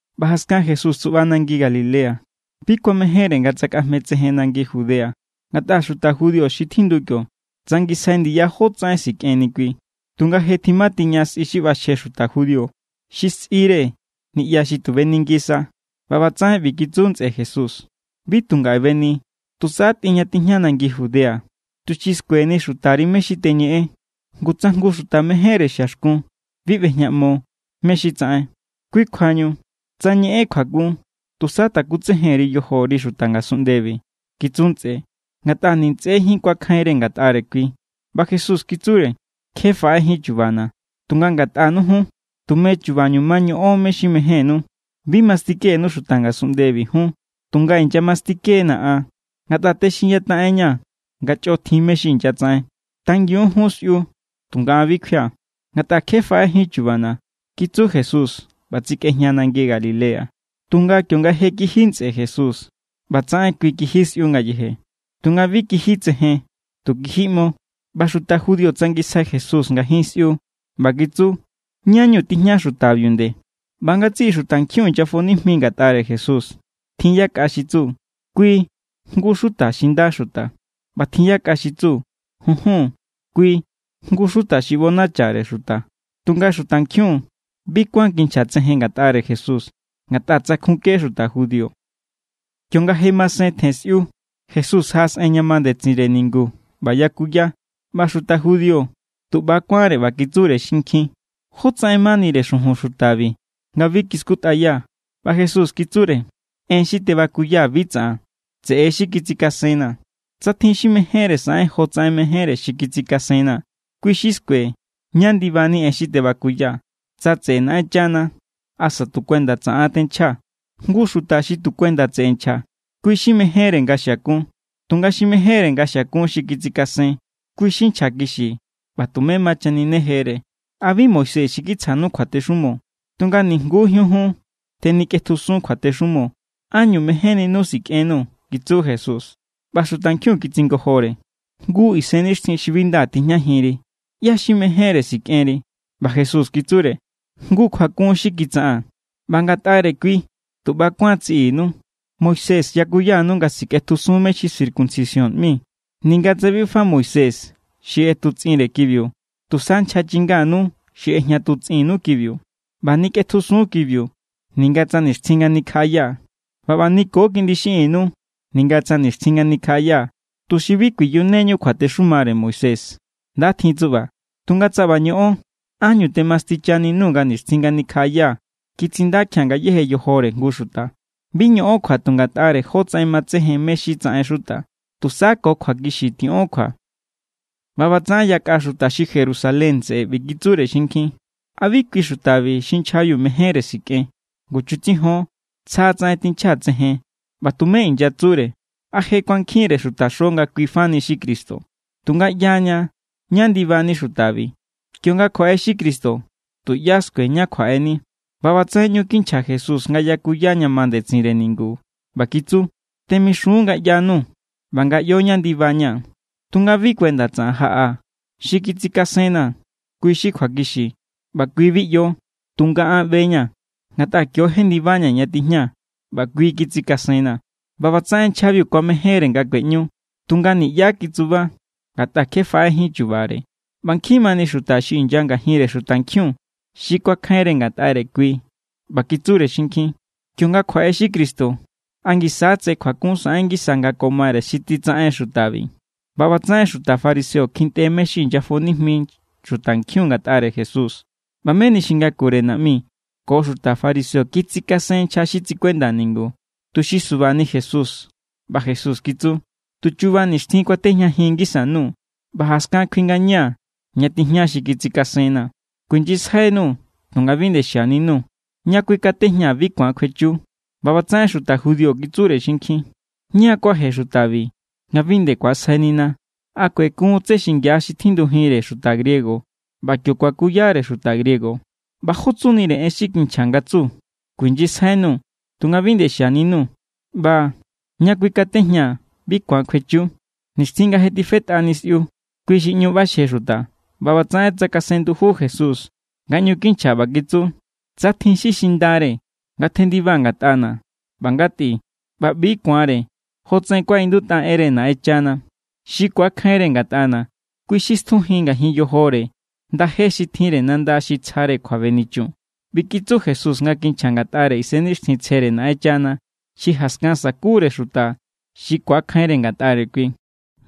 ꞌBa jaskan Jesús tsuꞌba nangi Galilea. Bi kuamejénre nga tsakꞌajme tsejen nangi Judea, ngatꞌa xuta judío xi tjindu kio tsangisjai ndiya jótsaꞌen sikꞌenni kui. Tunga je tjimatiña sꞌi xi ꞌbaxje xuta judío xi sꞌire niꞌya xi tu beni ngisa. ꞌBa ꞌbatsaꞌen ꞌbi kitsu ntsꞌe Jesús: —Bi tu ngaꞌe beni. Tusa tꞌin ña tijña nangi Judea, tuxi skueni xutari mé= xi teñeꞌen. Ngu tsa jngu xuta mejénre xiaxkun bi ꞌbejñaꞌmo mé= xi tsaꞌen. Kui kjuañu tsa ñeꞌen kjuakun, tusa takutsejen_ri yojori xuta ngasunꞌndebi —kitsu ntsꞌe, ngatꞌa ni ntsꞌejín kuakjainre ngatꞌare kui. ꞌBa Jesús kitsure: —Kje faꞌejín chubana̱. Tunga ngatꞌanu jun, tume chubañu ma ñoꞌon mé= xi mejénnú. Bi ma mastikenu xuta ngasunꞌndebi jun, tunga inyamastike=na̱ an ngatꞌa texinyataꞌenña̱ nga chꞌo tjin mé= xi inyatsaꞌen. Tangiun jun sꞌiu. Tunga an bi kjuia̱, ngatꞌa kje faꞌejín chubana̱ —kitsu Jesús ꞌba tsekꞌejña nangi Galilea. Tunga kionga je kiji ntsꞌe Jesús, ꞌbatsaꞌen kui kiji sꞌiu ngayeje. Tunga bi kiji tsejen, tu kiji ꞌmo. ꞌBa xuta judío tsangisjai Jesús ngajin sꞌiu, ꞌba kitsu: —¿Ñá=ñu tijña xutabiu nde? ꞌBa ngatsiꞌi xutankjiun inyafo nijmi ngatꞌare Jesús. Tjin yakꞌa xi tsu: “Kui jngu= xuta xi nda xuta.” ꞌBa tjin yakꞌa xi kitsu: “Junjun. Kui jngu= xuta xi ꞌbonachare xuta.” Tunga xutankjiun bi kuán kinchja tsejen ngatꞌare Jesús, ngatꞌa tsankjunke xuta judío. Kionga je masen tjen sꞌiu, Jesús jaꞌasꞌen ña ma ndetsinre ningu ꞌba yakuya. ꞌBa xuta judío tu ꞌba= kuánre ꞌba kitsure xinkjin: —¿Jótsaꞌen manire xujun xutabi, nga bi kiskutꞌaya? ꞌBa Jesús kitsure: —En xi tebakuyaa̱ bi tsaꞌan. Tseꞌe xi kitsikasenna̱. Tsa tjin xi mejénre saꞌen jotsaꞌen mejénre xi kitsikasenna̱, kui= xi skue ñá ndibani en xi tebakuyaa̱, tsa tseꞌe Naꞌenchana asa tu kuenda tsaꞌan tenchjaa̱. Jngu xuta xi tu kuenda tseꞌe nchja, kui= xi mejénre nga xiakun. Tunga xi mejénre nga xiakun xi kitsikasen, kui= xi nchjakixi ꞌba tumé ma chaninejere. ’¿A bi Moisés xi kitsjanu kjuatexumo? Tunga nijngujín jun tenikꞌetjusun kjuatexumo. ¿Ánñu mejénninu sikꞌennuu̱? —kitsu Jesús. ꞌBa xutankjiun kitsingojore: —¡Ngu isennixtjin xi bi nda tijñajinri! ¿ꞌYá= xi mejénre sikꞌenri? ꞌBa Jesús kitsure: —Jngu kjuakun xi kitsaꞌaa̱n, ꞌba ngatꞌare kui tu ꞌba= kuán tsiꞌinu. Moisés yakuyanu nga sikꞌetjusun mé= xi circuncisión ꞌmi (ninga tsa bi fa Moisés xi ꞌetutsꞌinre kibiu, tusa nchja chinganu xi ꞌejñatutsꞌinnu kibiu.) ꞌBa nikꞌetjusun kibiu ninga tsa nixtjin nga nikjaꞌaya. ꞌBa ꞌba niko kiꞌndi xiꞌinnu ninga tsa nixtjin nga nikjaꞌaya, tuxi bi kuiyuneñu kjuatexumare Moisés. Nda tjin tsuꞌba. Tunga tsa ꞌba ñoꞌon, ¿ánñu temastichaninuu̱ nga nixtjin nga nikjaꞌaya kitsindakjia̱n ngayéje yojore jngu xuta? Bi ñoꞌon kjua tu ngatꞌare jotsaꞌen matsejen mé= xi tsaꞌen xuta. Tusa ko kjuakixi tiꞌon kjua. ꞌBa ꞌbatsaꞌen yakꞌa xuta xi Jerusalén tseꞌe ꞌbi kitsure xinkjin: —¿A bi kui xutabi xi nchjabiu mejénre sikꞌen? Ngu chutsijon. Tsja tsaꞌen tinchja tsejen ꞌba tumé inyatsure. ¿A je kuankjinre xutaxo nga kui fa ni xi Cristo? Tunga ꞌyaña ñá ndibani xutabi. Kionga kjuaꞌe xi Cristo, tuꞌyá skue ñá kjuaꞌeni. ꞌBa ꞌbatsaꞌen ꞌñu kinchja Jesús nga yakuya ña ma ndetsinre ningu ꞌba kitsu: —Temixun nga ꞌyanuu̱ ꞌba nga ꞌyo ñá ndibaña̱. Tunga bi kuenda tsaꞌan jaꞌaa̱. Xi kitsikasenna̱, kui= xi kjuakixi ꞌba kui bi ꞌyo. Tunga an ꞌbe=ña̱. Ngatꞌa kio= jendibaña̱ ña tijña, ꞌba kui= xi kitsikasenna̱. ꞌBa ꞌbatsaꞌen nchjabiu kuamejénre nga kueꞌñu, tunga niꞌyá kitsuba, ngatꞌa kje faꞌejín chubare. ꞌBa nkjin mani xuta xi inya ngajinre xutankjiun xi kuakjainre ngatꞌare kui ꞌba kitsure xinkjin: —Kionga kjuaꞌe xi Cristo, ¿a ngisa= tse kjuakun saꞌen ngisa nga ko mare xi titsaꞌen xutabi? ꞌBa ꞌbatsaꞌen xuta fariseo kjintꞌe mé= xi inyafo nijmi xutankjiun ngatꞌare Jesús. ꞌBa meni xi ngakure naꞌmi ko xuta fariseo kitsikasen nchja xi tsikuenda ningu, tuxi subani Jesús. ꞌBa Jesús kitsu: —Tu chuba nixtjin kuatejñajin ngisa_nuu̱, ꞌba jaskan kjui ngaña̱ ña tijña xi kitsikasenna̱. Kuijnyisjainuu̱ tunga bi nde xianinu. Ña kuikatejñaa̱ bi ku̱an kjuechu. ꞌBa ꞌbatsaꞌen xuta judío kitsure xinkjin: —¿Ñá= kuaje xutabi, nga bi nde ku̱asjainina? ¿A kuekun tsé xingia xi tjindujinre xuta griego ꞌba kio kuakuyare xuta griego? ꞌBa: ¿Jó tsunire en xi kinchja nga tsu: “Kuijnyisjainuu̱ tunga bi nde xianinu”, ꞌba: “Ña kuikatejñaa̱ bi ku̱an kjuechu”? Nixtjin nga je tifetꞌani̱ sꞌiu, kui xi ꞌñu ꞌbaxje xuta, ꞌba ꞌbatsaꞌen tsakasen nduju Jesús nga ꞌñu kinchja ꞌba kitsu: —Tsa tjin xi xindare, ngatjendiba ngatꞌana̱ ꞌba ngatꞌi. ꞌBa ꞌbi ku̱anre jotsaꞌen kuaꞌindutꞌa enre Naꞌenchana. Xi ku̱akjainre ngatꞌana̱, kui= xi stjujin ngajin yojore ndaje xi tjinre nanda xi tsjare kjuabenichun. ꞌBi kitsu Jesús nga kinchja ngatꞌare Isennixtjintsjere Naꞌenchana xi jaskan sakure xuta xi ku̱akjainre ngatꞌare kui.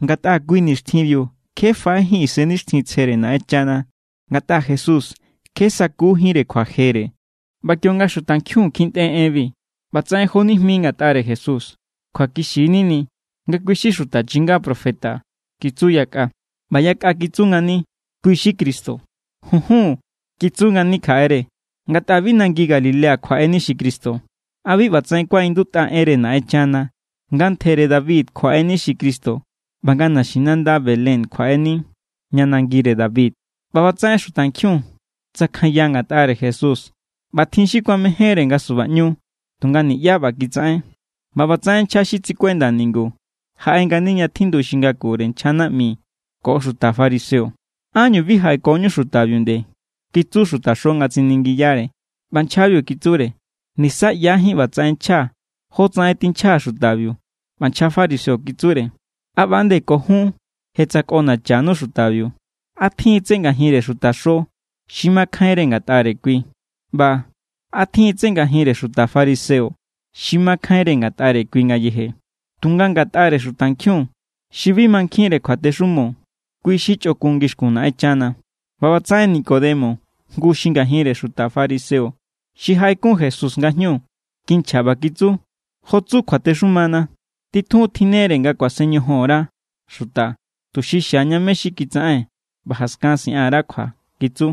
Ngatꞌa kui nixtjinbiu kje faꞌejín Isennixtjintsjere Naꞌenchana, ngatꞌa Jesús kje sakujínre kjuajere. ꞌBa kionga xutankjiun kjintꞌe enbi, ꞌbatsaꞌen jonijmi ngatꞌare Jesús. —Kjuakixi=nini nga kui= xi xuta chinga profeta —kitsu yakꞌa. ꞌBa yakꞌa kitsu ngani: —Kui= xi Cristo. —Junjun —kitsu ngani kjaꞌere—. Ngatꞌa bi nangi Galilea kjuaꞌeni xi Cristo. ¿A bi ꞌbatsaꞌen kuaꞌindutꞌa enre Naꞌenchana, nga ntjere David kjuaꞌeni xi Cristo ꞌba nga naxinanda Belén kjuaꞌeni, ña nangire David? ꞌBa ꞌbatsaꞌen xutankjiun tsakjanya ngatꞌare Jesús. ꞌBa tjin xi kuamejénre nga subaꞌñu, tunga niꞌyá ꞌba kitsaꞌen. ꞌBa ꞌbatsaꞌen nchja xi tsikuenda ningu jaꞌe ngani ña tjindu xi ngakure nchja naꞌmi ko xuta fariseo. —¿Ánñu bi jaꞌekoñu xutabiu nde? —kitsu xutaxo nga tsiningiyare. ꞌBa nchjabiu kitsure: —Niꞌsa ꞌyajín ꞌbatsaꞌen nchja jotsaꞌen tinchja xutabiu. ꞌBa nchja fariseo kitsure: —¿A ꞌba=nde ko jun je tsakꞌonachanu xutabiu? ¿A tjin tsé ngajinre xutaxo xi makjainre ngatꞌare kui? ꞌBa ¿a tjin tsé ngajinre xuta fariseo xi makjainre ngatꞌare kui ngayeje? Tunga ngatꞌare xutankjiun xi bi mankjinre kjuatexumo, kui= xi chꞌokun ngixkun Naꞌenchana. ꞌBa ꞌbatsaꞌen Nicodemo, jngu xi ngajinre, xuta fariseo xi jaꞌekun Jesús nga jñu, kinchja ꞌba kitsu: —Jo tsu kjuatexumana, titjun tjinnere nga kuasen ñojon_ra xuta, tuxi xiaña mé= xi kitsaꞌen. ꞌBa jaskan siꞌan_ra kjua —kitsu.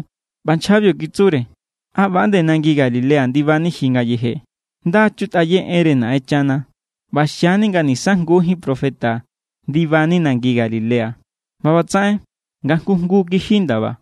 ꞌBa nchjabiu kitsure: —¿A ꞌba=nde nangi Galilea ndibani ji ngayeje? Nda chutꞌaye enre Naꞌenchana ꞌba xiani nga nisa jngujín profeta ndibani nangi Galilea. ꞌBa ꞌbatsaꞌen nga jngu jngu kiji ndaba.